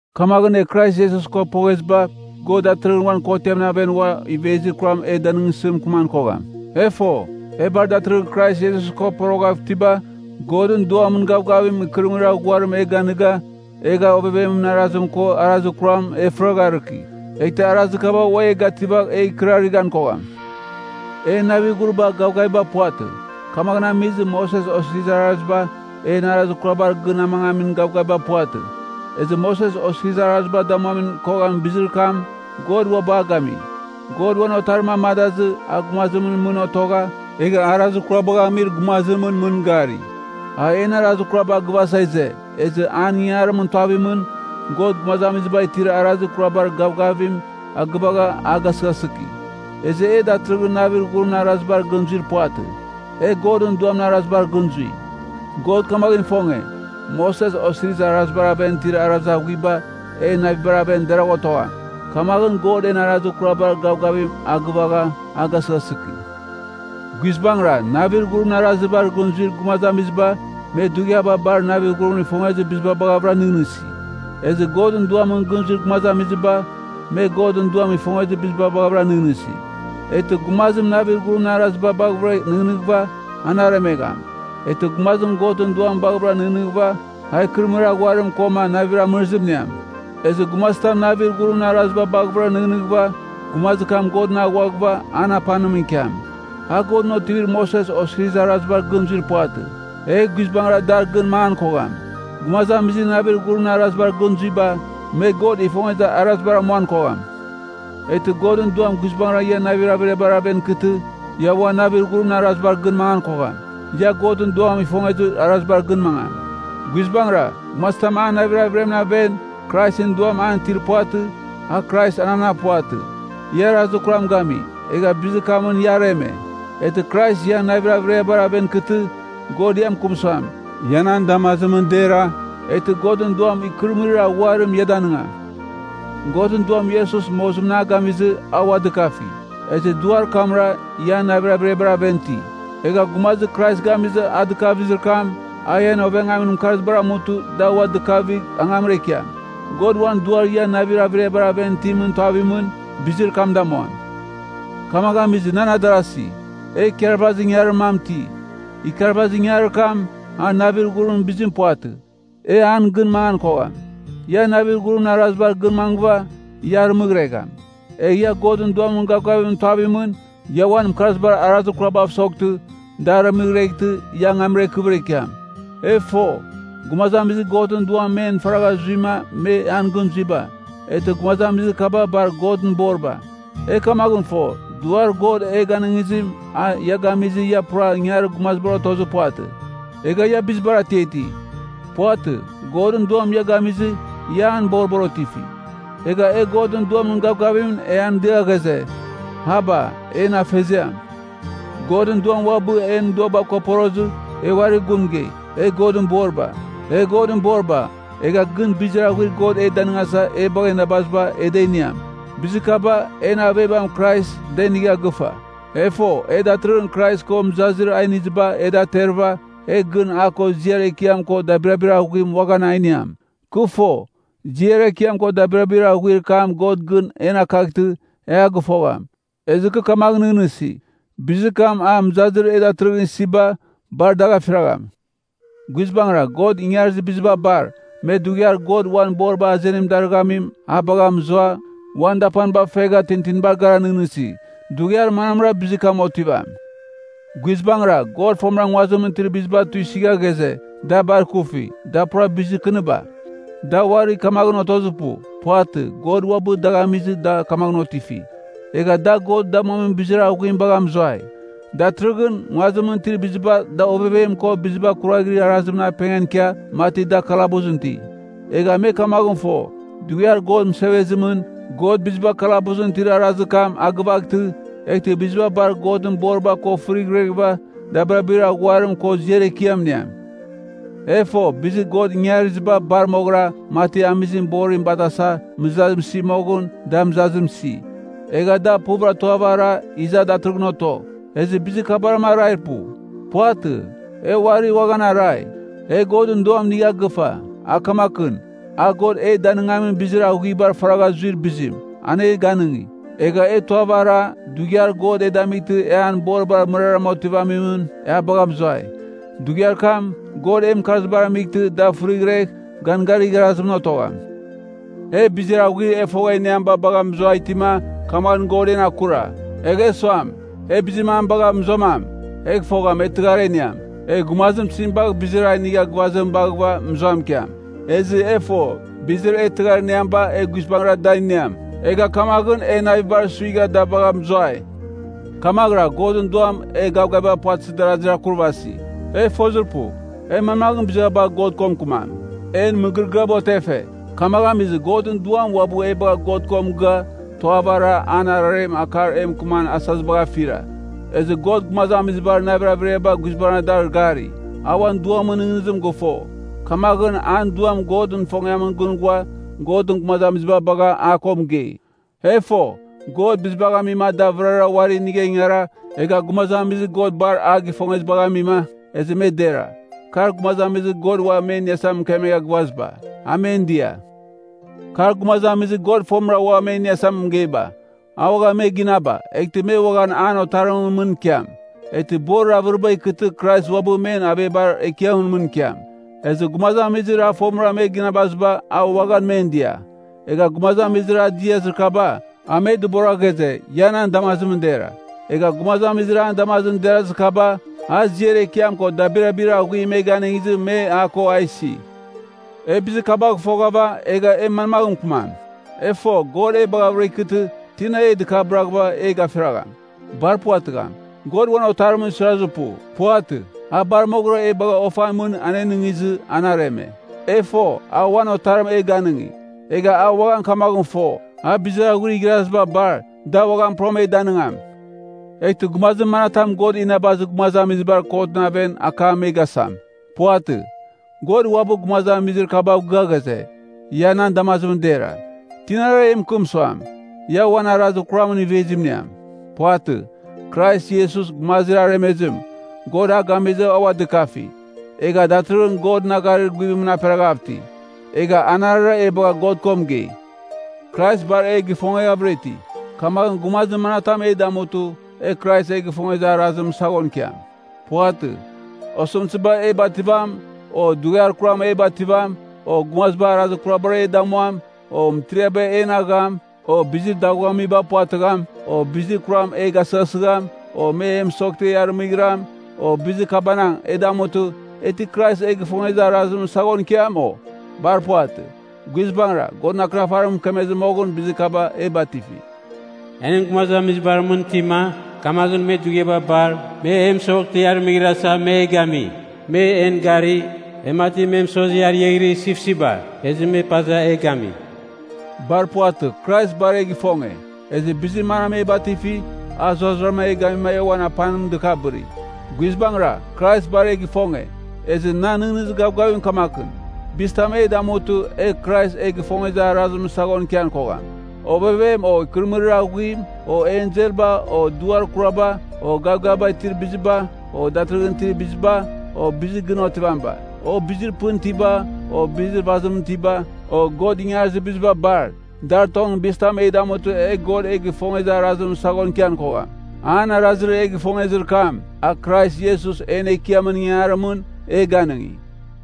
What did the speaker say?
Kamaghɨn e Krais Iesus ko pogheziba, God datɨrɨghɨn uan kotiamɨn aven uam ivezir kuram e danɨngsɨ mɨkɨman kogham. E fo, e bar datɨrɨghɨn Krais Iesus ko poroghav itiba, Godɨn Duamɨn gavgavim ikɨrɨmɨrir aghuarim e ganɨga, egha ovevemɨn arazim ko arazir kuramɨn e fɨragharɨki. Eghtɨ arazir kaba ua e gativagh e ikɨrarɨghan kogham. En navir ghuriba, gavgaviba puvatɨ. Kamaghɨn amizɨ, Moses Osirizir Araziba, en arazir kurabar gɨn amangamin gavgaviba puvatɨ. Ezɨ Moses Osirizir Araziba damuan koghamin bizir kam, God uabɨ a gami. God uan Otarim amadazɨ, a gumazimɨn mɨn otogha, egha arazir kurabagh amir gumazimɨn mɨn gari. A en arazir kuraba agɨvasa ize, ezɨ an ingangarimɨn tuavimɨn, God gumazamiziba itir arazir kurabar gavgavim agɨvagha a gasɨghasɨki. Ezɨ e datɨrɨghɨn navir ghurimɨn arazibar gɨn zuir puvatɨ, e Godɨn Duamɨn arazibar gɨn zui. God kamaghɨn ifonge, Moses Osirizir Arazibar aven itir arazir aghuiba en navibar aven deragh otogham. Kamaghɨn God en arazir kurabar gavgavim a gɨvagha a gasɨghasɨki. Guizbangɨra, navir ghurimɨn arazibar gɨn zuir gumazamiziba, me dughiaba bar navir ghurim ifongezir biziba baghavɨra nɨghnɨsi. Ezɨ Godɨn Duamɨn gɨn zuir gumazamiziba, me Godɨn Duam ifongezir biziba baghavɨra nɨghnɨsi. Eghtɨ gumazim navir ghurimɨn araziba baghɨvɨra nɨghnɨghɨva, an aremegham. Eghtɨ gumazim Godɨn Duam baghɨvɨra nɨghnɨghɨva, a ikɨrɨmɨrir aghuarim koma navir amɨrizim iniam. Ezɨ gumazitam navir ghurimɨn araziba baghɨvɨra nɨghnɨghɨva, gumazir kam Godɨn aghuaghɨva an apanimɨn ikiam. A Godɨn otivir Moses Osirizir Arazibar gɨn zuir puvatɨ; egh guizbangɨra dar gɨn mangan kogham. Gumazamizir navir ghurimɨn arazibar gɨn zuiba, me God ifongezir arazibar amuan kogham. Eghtɨ Godɨn Duam guizbangɨra ian navir averiabar aven ikɨtɨ, ia ua navir ghurimɨn arazibar gɨn mangan kogham, ia Godɨn Duam ifongezir arazibar gɨn mangam. Guizbangɨra, gumazitam an navir averiamɨn aven Kraisɨn Duam an itir puvatɨ, a Kraisɨn anam puvatɨ. Ia arazir kuram gami, egha bizir kamɨn ia areme. Eghtɨ Krais ian navir averiabar aven ikɨtɨ, God ia mɨkɨm suam, ia nan damazimɨn dera, eghtɨ Godɨn Duam ikɨrɨmɨrir aghuarim ia danɨngam. Godɨn Duam Iesus mozimɨn a gamizɨ a ua dɨkafi, ezɨ Duar kamra, ian navir averiabar aven iti. Egha gumazir Krais gamizɨ a dɨkavizir kam, a ian ovengamin mɨkarzibar amutɨ, da ua dɨkavighɨva angamra ikiam. God uan Duar ian navir averiabar aven itimɨn tuavimɨn, bizir kam damuam. Kamaghɨn amizɨ, nan adarasi, e ikarvazir ingangarir mam iti. Ikarvazir ingangarir kam, a navir ghurimɨn bizim puvatɨ, e an gɨn mangan kogham. Ia navir ghurimɨn arazibar gɨn mangɨva, ia arɨmɨghregham. Egh ia Godɨn Duamɨn gavgavimɨn tuavimɨn, ia uan mɨkarzibar arazir kurabav soghtɨ, da aremeghtɨ, ia angamra ikɨvɨra ikiam. E fo, gumazamizir Godɨn Duam men faragha zuima me an gɨn zuiba, eghtɨ gumazamizir kaba bar Godɨn boriba. E kamaghɨn fo, Duar God ia ganɨngizim, a ia gamizɨ, ia pura ingangarir gumazibar otozir puvatɨ, egha ia bizibar atiati. Puvatɨ. Godɨn Duam ia gamizɨ, ia an boribar otifi. Egha e Godɨn Duamɨn gavgavimɨn e an dia ghaze, “Aba, En Afeziam!” Godɨn Duam uabɨ, a en duaba ko porozɨ, e uarir gun mɨgei, e Godɨn boriba. E Godɨn boriba, egh gɨn bizir aghuir God e danɨngasa e bagha inabaziba, e da iniam. Bizir kaba, en avebam Krais da inigha gɨfa. E fo, e datɨrɨghɨn Krais ko mɨzazir a iniziba e da aterɨva, egh gɨn a ko ziar ekiam ko dabirabir aghuim uaghan a iniam. Kɨ fo, ziar ekiam ko dabirabir aghuir kam God gɨn en akaghtɨ, e a gɨfogham. Ezɨ kɨ kamaghɨn nɨghnɨsi, bizir kam a, mɨzazir e datɨrɨghɨn isiba, bar dagh afiragham. Guizbangɨra, God ingarizir biziba bar, me dughiar God uan boriba azenim darɨghamim a bagha mɨzua, uan dapaniba fegha tintinibar gara nɨghnɨghɨsi, dughiar manamra bizir kam otivam? Guizbangɨra, God fomɨra nguazimɨn itir biziba da tuisɨgha ghaze, da bar ikufi, da pura bizir kɨniba. Da uari kamaghɨn otozir pu. Puvatɨ. God uabɨ dagh amizɨ da kamaghɨn otifi. Egha da God damuamin bizir aghuim bagha mɨzuai. Datɨrɨghɨn, nguazimɨn itir biziba da ovevem ko biziba kuraghrir arazimɨn apengan ikia, mati da kalabusɨn iti. Egha me kamaghɨn fo, dughiar God mɨsevezimɨn, God biziba kalabusɨn itir arazir kam a gɨvaghtɨ, eghtɨ biziba bar Godɨn boriba ko fɨrighreghɨva dabirabir aghuarim ko ziar ekiam iniam. E fo, bizir God ingariziba bar moghɨra, mati amizim borim batasa mɨzazim isi moghɨn, da mɨzazim isi. Egha da bar puv tuava ara, iza datɨrɨghɨn oto. Ezɨ bizir kabarama arair pu. Puvatɨ, e uari uaghan arai. E Godɨn Duam inigha gɨfa, a kamakɨn, a God e danɨngamin bizir aghuibar faragha zuir bizim, an e ganɨngi. Egha e tuava ara, dughiar God e damightɨ e an boribar mɨraram otivamimɨn, e a bagha mɨzuai. Dughiar kam, God en mɨkarzibar amightɨ da fɨrighregh ganganir igharazimɨn otogham. E bizir aghuir e fogha iniamiba bagha mɨzuai itima, kamaghɨn God en akura. Egh e suam, e bizir mam bagh mɨzuamam, egh fogham, e tɨghar a iniam. Egh gumazim tizim bagh bizir a inigha gɨvazim baghɨva mɨzuam ikiam? Ezɨ e fo, bizir e tɨghar iniamiba e guizbangɨra da iniam. Egha kamaghɨn e navibar suigha da bagha mɨzuai. Kamaghɨra, Godɨn Duam e gavgaviba puvatɨzir darazir akurvasi. E fozir pu, e manmagh biziba bagh God ko mɨkɨmam? En mɨgɨrɨgɨaba otefe. Kamaghɨn amizɨ, Godɨn Duam uabɨ e bagha God ko mɨgɨa, tuava ara, an ararem akar e mɨkɨman asazibagh afira. Ezɨ God gumazamizibar navir averiaba guizbangɨra dar gari. A uan Duamɨn nɨghnɨzim gɨfo. Kamaghɨn, an Duam Godɨn ifongiamɨn gɨn ghua Godɨn gumazamiziba bagha a ko mɨgei. E fo, God bizibagh amima da vɨrara uari inigha ingara, egha gumazamizir God bar a gifongezibagh amima, ezɨ me dera. Kar gumazamizir God ua me iniasa mɨkemegha gɨvaziba, a men dia. Kar, gumazamizir God fomɨra ua me iniasa mɨgeiba, a uaghan me ginaba, eghtɨ me uaghan an Otarimɨn mɨn ikiam. Eghtɨ borir avɨriba ikɨtɨ Krais uabɨ men avebar ekiamɨn mɨn ikiam. Ezɨ gumazamizir a fomɨra me ginabaziba, a uaghan men dia. Egha gumazamizir a diazir kaba, a me dɨbora ghaze, ia nan damazimɨn dera. Egha gumazamizir an damazimɨn derazir kaba, a ziar ekiam ko dabirabir aghuim me ganɨngizɨ me a ko a isi. E bizir kabagh foghava, egh e manmaghɨn mɨkɨmam? E fo, God e baghɨvɨra ikɨtɨ, tina e dɨkabɨraghɨva e gafiragham? Bar puvatɨgham. God uan Otarimɨn suirazir pu. Puvatɨ, a bar moghɨra e bagha ofan mɨn anenɨngizɨ, an areme. E fo, a uan Otarim e ganɨngi, egha e uaghan kamaghɨn fo, a bizir aghuir igharaziba bar, da uaghan pura e danɨngam. Eghtɨ gumazir manatam God inabazir gumazamizibar kotɨn aven akam me gasam? Puvatɨ. God uabɨ gumazamizir kabav gɨa ghaze, ia nan damazimɨn dera. Tinara e mɨkɨm suam, ia uan arazir kuramɨn ivezim iniam? Puvatɨ, Krais Iesus, gumazir aremezim, God a gamizɨ a ua dɨkafi, egha datɨrɨghɨn Godɨn agharir guvimɨn aperaghav iti. Egha anarɨra e bagha God ko mɨgei! Krais bar e gifongeghavɨra iti, kamaghɨn gumazir manatam e damutɨ, e Krais e gifongezir arazimɨn saghon ikiam? Puvatɨ. Osɨmtɨziba e bativam, o dughiar kuram e bativam, o gumaziba arazir kurabar e damuam o, mɨtiriaba en agham o, bizir daghuamiba puvatɨgham o, bizir kuram e gasɨghasɨgham o, me e mɨsoghtɨ e arɨmɨghiram o, bizir kabanang e damutɨ, e ti Krais e gifongezir arazimɨn saghon ikiam, o? Bar puvatɨ. Guizbangɨra, Godɨn Akɨnafarim mɨkemezɨ moghɨn bizir kaba e batifi: “E nɨn gumazamizibar mɨn itima, kamaghɨn me dughiaba bar, me e mɨsoghtɨ e arɨmɨghrasa, me e gami. Me en gari, e mati me mɨsozi ariaghɨrir sipsipba, ezɨ me paza e gami.” Bar puvatɨ. Krais bar e gifonge, ezɨ bizir manam e batifi, a zurara e gamima e uan apanim dɨkabɨri. Guizbangɨra, Krais bar e gifonge, ezɨ nan nɨghnɨzir gavgavim kamakɨn, bizitam e damutɨ, e Krais e gifongezir arazimɨn saghon ikian kogham: ovevem, o ikɨrɨmɨrir aghuim, o enselba, o duar kuraba, o gavgaviba itir biziba, o datɨrɨghɨn itir biziba, o bizir gɨn otivamiba, o bizir pɨn itiba, o bizir vazimɨn itiba, o God ingarizir biziba bar, dar tongɨn bizitam e damutɨ, e God e gifongezir arazimɨn saghon ikian kogham. An arazir e gifongezir kam, a Krais Iesus en Ekiamɨn ingangarimɨn, e ganɨngi.